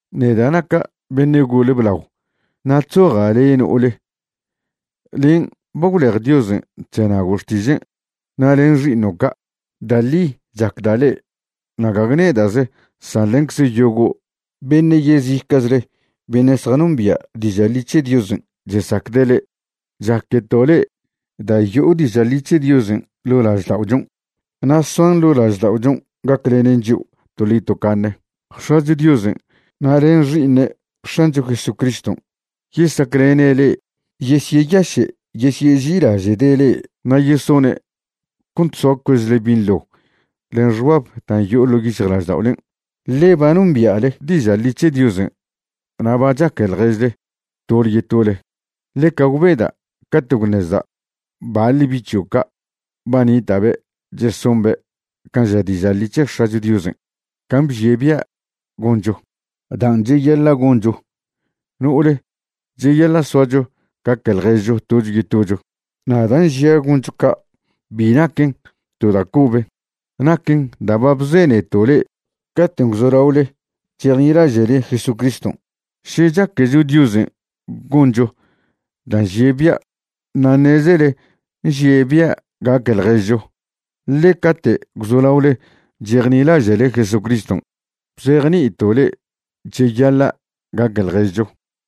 Neda' naca' beṉe' gole blao, na' chzoja' le' no'ole, len' ba gwlej Diosen' chzenago' xtižen', na' len xi'iṉo' ca'. Da' ḻi chacda' le'e, na' gague nedaze' san lencze' yogo' beṉe' yezica'chle beṉe' zjanombia' diža' ḻi c̱he Diosen' chesacde' le'e. Chaqueto' le'e da' yo'o diža' ḻi c̱he Diosen' ḻo' lažda'ochon' na' soan ḻo' lažda'ochon' gaclenen chio' toḻi tocaṉe. X̱acho Diosen' na' len Xi'iṉe' X̱ancho Jesucriston' yesaclene' le'e, yesyeyaše' yesyeži'ilaže'de' le'e na' yesone' cont soa cuezle binḻo len xbab dan' yo'o ḻo' yic̱hjlažda'olen', ḻe ba nombia'le diža' ḻi c̱he Diosen' na' ba chaque ḻježle tole yetole. Ḻeca gwbeda' cate' gwṉezda' baḻ bi' c̱hio' ca' ba nita'be' chesombe' can' ža diža' ḻi c̱he X̱acho Diosen' can' bžie' bia' goncho. Dan' cheyaḻa' goncho, no'ole, cheyaḻa' soacho gaque ḻježcho tocho yetocho. Na' dan' žia' goncho ca', bi naquen to da' cobe; naquen dan' ba bzeneto' le'e caten' gwzolaole chejnilaže'le Jesucriston'. Še chaquecho Diosen' goncho da' nžie' bia'. Na' ṉezele nžie' bia' gaque ḻježcho, ḻe cate' gwzolaole chejnilaže'le Jesucriston' bzejni'ito' le'e cheyaḻa' gaque ḻježcho.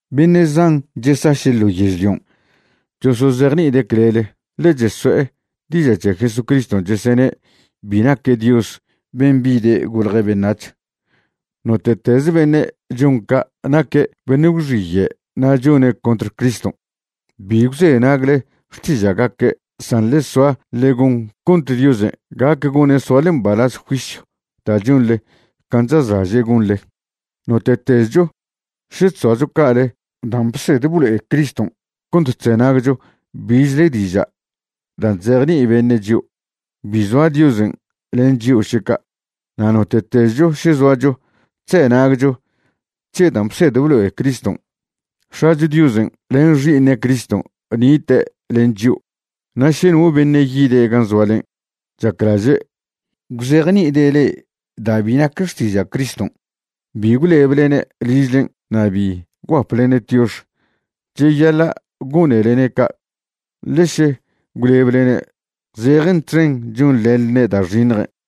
Beṉe' zan chesaše' ḻo yežlion' chosozejni'ide' clele, ḻe cheso'e diža' c̱he Jesucriston' chesene' bi naque' Dios ben' bide' golje' beṉac̱h. Note'tez beṉe' chon ca' naque' beṉe' gwxiye' na' chone' contr Criston'. Bi gwzenagle xtiža'gaque' san ḻe soa ḻe gon cont Diosen' gac gone' soale mbalaz juisyw da' chonḻe can' chazlaže' gonḻe. Note'tezcho še chzoacho ca'ale dan' bsed blo'e Criston' cont chzenagcho bichle diža' dan' chzejni'i beṉe' chio', bi zoa Diosen' len chio' še ca'. Na' note'tezcho še zoacho chzenagcho c̱he dan' bsed blo'e Criston', X̱acho Diosen' len Xi'iṉe' Criston' nite' len chio'. Na' še no beṉe' yide' gan' zoalen' chaclaže' gwzejni'ide' le'e da' bi nac xtiža' Criston', bi gwleblene' ližlen' na' bi gwguaplene' tiox. Cheyaḻa' gonelene' ca', ḻe še gwlebelene' zejen txen chonḻenḻne' da' xiṉjen'.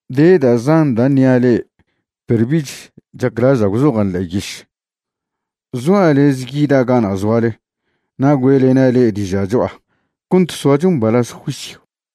De da' zan da' ṉia' le'e perw bich chaclaža' gwzojan' ḻe'e yiš. Zoa' lez yida' gana' zoale na' güe'lena' le'e diža' cho'a cont soacho mbalaz juisyw.